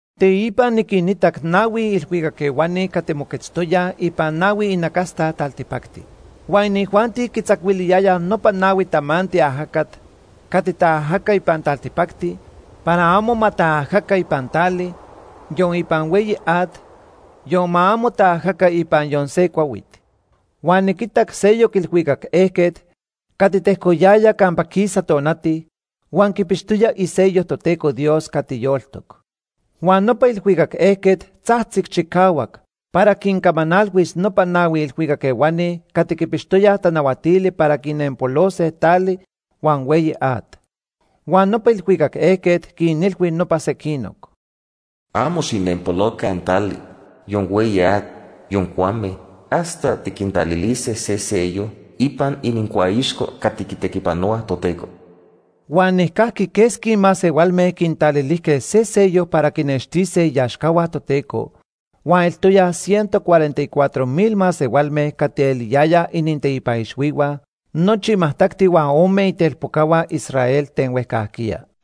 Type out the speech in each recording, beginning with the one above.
Teipa niquinitac nahui ilhuicac ehuani cati moquetztoyaj ipan nahui inacasta taltipacti. Huan inijuanti quitzacuiliyayaj nopa nahui tamanti ajacat cati taajaca ipan taltipacti para amo ma taajaca ipan tali, yon ipan hueyi at, yon ma amo taajaca ipan yon se cuahuit. Huan niquitac seyoc ilhuicac ejquet cati tejcoyaya campa quisa tonati huan quipixtoya isello Toteco Dios cati yoltoc. Huan nopa ilhuicac ejquet tzajtzic chicahuac para quincamanalhuis nopa nahui ilhuicac ehuani cati quipixtoyaj tanahuatili para quinenpolose tali huan hueyi at. Huan nopa ilhuicac ejquet quinilhui nopa sequinoc: “Amo xijnempoloca tali, yon hueyi at, yon cuame, hasta tiquintalilise se sello ipan inincuaixco cati quitequipanohuaj Toteco.” Huan nijcajqui quesqui masehualme quintalilijque se sello para quinextise iaxcahua Toteco huan eltoyaj ciento cuarenta y cuatro mil masehualme cati eliyayaj ininteipan ixhuihua nochi majtacti huan ome itelpocahua Israel ten huejcajquiya.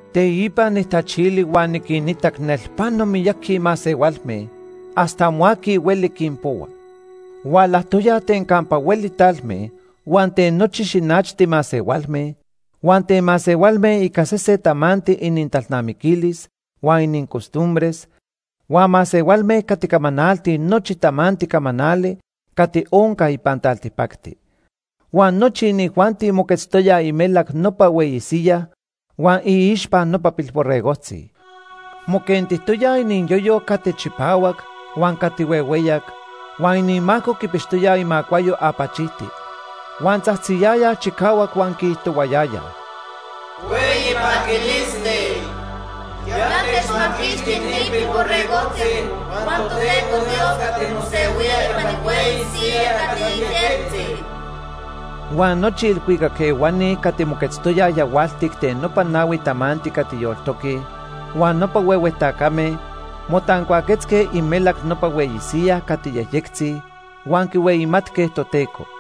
Teipa nijtachili huan niquinitac nelpano miyaqui masehualme hasta amo aqui hueli quinpohua. Hualajtoyaj ten campa hueli talme, huan ten nochi xinachti masehualme, huan ten masehualme ica sesen tamanti inintalnamiquilis huan inincostumbres, huan masehualme cati camanaltij nochi tamanti camanali cati onca ipan taltipacti. Huan nochi inijuanti moquetztoyaj imelac nopa hueyi siyaj huan iixpa nopa Pilborregojtzi. Moquentijtoyaj iniyoyo cati chipahuac huan cati huehueyac huan inimaco quipixtoyaj imacuayo apachijti, huan tzajtziyayaj chicahuac huan quiijtohuayayaj: “¡Hueyi paquilisti! Ya techmaquixti ni Pilborregojtzi huan Toteco Dios cati mosehuía ipan ihueyi siyaj cati yejyectzi.” Huan nochi ilhuicac ehuani cati moquetztoyaj yahualtic ten nopa nahui tamanti cati yoltoque huan nopa huehue tacame motancuaquetzque imelac nopa hueyi siyaj cati yejyectzi huan quihueyimatque Toteco.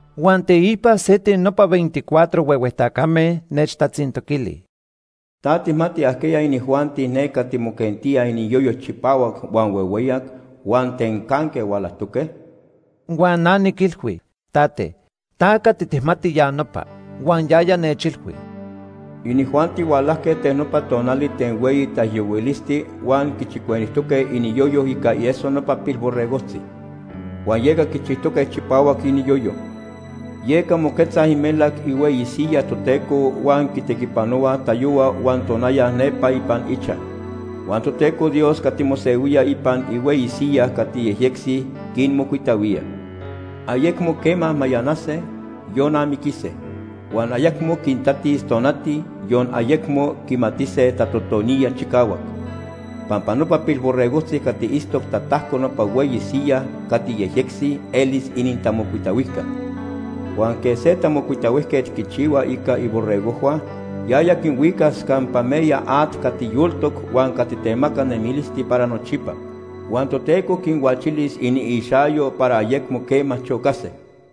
Huan teipa se ten nopa veinticuatro huehue tacame nechtatzintoquili: “¿Ta tijmati ajquiya inijuanti ne cati moquentíaj iniyoyo chipahuac huan huehueyac, huan ten canque hualajtoque?” Huan na niquilhui: “Tate, ta cati tijmati ya nopa.” Huan yaya nechilhui: “Inijuanti hualajque ten nopa tonali ten hueyi taijyohuilisti huan quichicuenijtoque iniyoyo ica ieso nopa Pilborregojtzi, huan yeca quichijtoque chipahuac iniyoyo. “Yeca moquetzaj imelac ihueyi siyaj Toteco huan quitequipanohuaj tayohua huan tonaya nepa ipan ichaj. Huan Toteco Dios cati mosehuía ipan ihueyi siyaj cati yejyectzi quinmocuitahuía. Ayecmo quema mayanase, yon amiquise. Huan ayecmo quintatis tonati, yon ayecmo quimatise tatotoniya chicahuac. Pampa nopa Pilborregojtzi cati itztoc tatajco nopa hueyi siyaj cati yejyectzi elis inintamocuitahuijca. Huan quej se tamocuitahuijquet quichihua ica iborregojhua, yaya quinhuicas campa meya at cati yoltoc huan cati temaca nemilisti para nochipa. Huan Toteco quinhuachilis iniixayo para ayecmo quema chocase.”